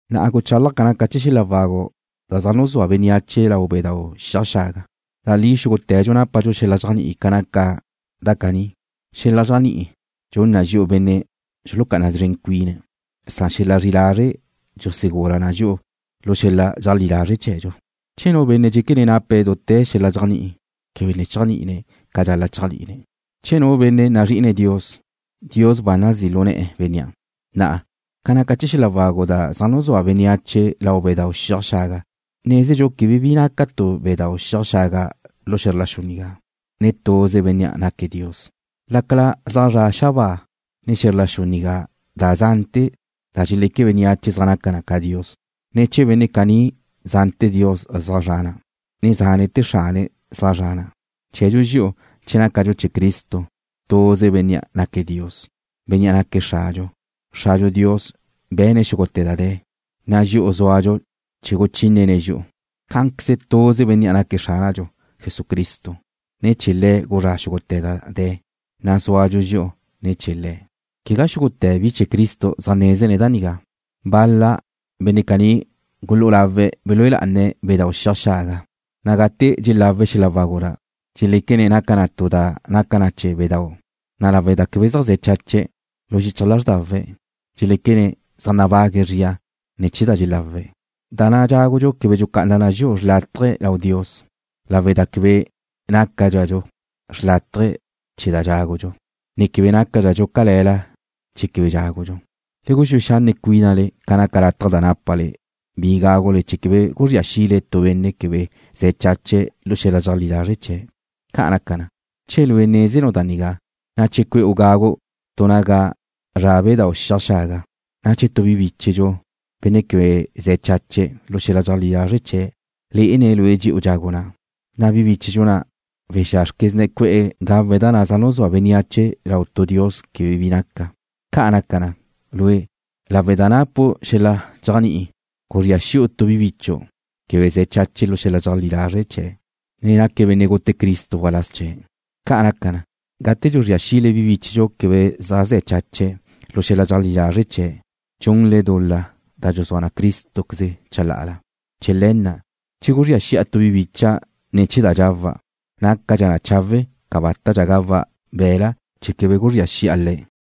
Na'a guchálaja' ca naca chee̱ xel-la wagu da zaj nuzúa bénneache lau bedáu' xiaj xaga. Da li xúgute̱dxu nápadxu xel-la dxéajni'i ca naca da nigá. Xel-la dxéajni'i dxun na dxi'u benne' dxulucá'ana szren cuina, san xel-la zri'i lazre' dxusegula na dxi'u lu xel-la dxeajlí lazre' chee̱dxu. Che nu benne' dxéquene̱' nape̱' dute̱ xel-la dxéajni'i, quebe ne chéajni'ine̱' ca dxal-la' chéajni'ine̱'. Che nu benne' nazrí'ine̱' Dios, Dios ba nazí' lu ne̱'e̱ bénnea'. Na'a, ca naca chee̱ xel-la wagu da zaj nuzúa bénneache lau bedáu' xiaj xaga, nezdxu quebe bi naca tu bedáu' xiaj xaga lu xe̱zr la xu nigá, ne tuze Bénnea' naque̱' Dios. Lácala zaj zra' xabáa, ne xe̱zr la xu nigá da zante̱ da dxeleque bénneache zaj naca na dios, ne chee̱ benne' caní zante̱ dios zaj zra na, ne zante̱ xrane̱' zaj zra na, chee̱dxu dxi'u che nácadxu chee̱ Cristo, tuze Bénnea' naque̱' Dios, Bénnea' naque̱' Xradxu. Xradxu Dios be̱ne̱' xúgute̱ da de̱, na' dxi'u zúadxu chee̱ guchínene̱' dxi'u. Cá'anqueze tuze Bénnea' naque̱' Xránadxu, Jesucristo. Ne̱ chee̱ Le̱' guzrá' xúgute̱ da de̱, na' zúadxu dxi'u ne̱ chee̱ Le̱'. Quegá xúgute̱ bi chee̱ Cristo zaj nézene̱' da nigá. Bal-la benne' caní gulú'u lawe̱' belúe lá'ane̱' bedáu' xiaj xaga, na' gate dxelawe̱' xel-la wagu na', dxeléquene̱' naca na tu da naca na chee̱ bedáu', na' lawe' da quebe zaj ze̱ chache̱' lu xichaj lázrdawe̱', dxeléquene̱' zaj nabague̱' zria ne̱ chee̱ da dxelawe̱'. Da na' dxágudxu quebe dxucá'anadxa na dxi'u xrlátaje lau Dios, lawe' da quebe nácadxadxu xrlátaje che dxágudxu, ne quebe nácadxadxu cale̱la che quebe dxágudxu. Le guxúe xanne' cuínale ca naca lataj da nápale bi gágule chee̱ quebe guzría xile tu benne' quebe ze̱ chache̱' lu xel-la dxeajlí lazre' chee̱'. Ca' naca na, che lue' nézenu' da nigá, na' che cue'u gagu' tu naga zra' bedáu' xiaj xaga, na' che tu bi bíchedxu, benne' quebe ze̱ chache̱' lu xel-la dxeajlí lazre' chee̱', lé'ene̱' lue' dxe'u dxagu' na', na' bi bíchedxu na' wexázrquezne̱' cue'e̱ gawe̱' da na' zaj nuzúa bénneache lau tu dios quebe bi naca. Ca' naca na, lue', lawe' da napu' xel-la dxéajni'i, guzría xi'u tu bi bichu' quebe ze̱ chache̱' lu xel-la dxeajlí lazre' chee̱', na' naque̱' benne' gute Cristo waláz chee̱'. Ca' naca na, gate dxuzría xile bi bíchedxu quebe zaj ze̱ chache̱' lu xel-la dxeleajlí lazre' chee̱', dxunle dul-la da dxuzúa Crístoqueze chalá'ala. Chee̱ le̱ na', che guzría xi'a tu bi bicha' ne̱ chee̱ da dxawa', nácadxa chawe' cabátadxa gawa' be̱la' chee̱ quebe guzría xi'a le̱'.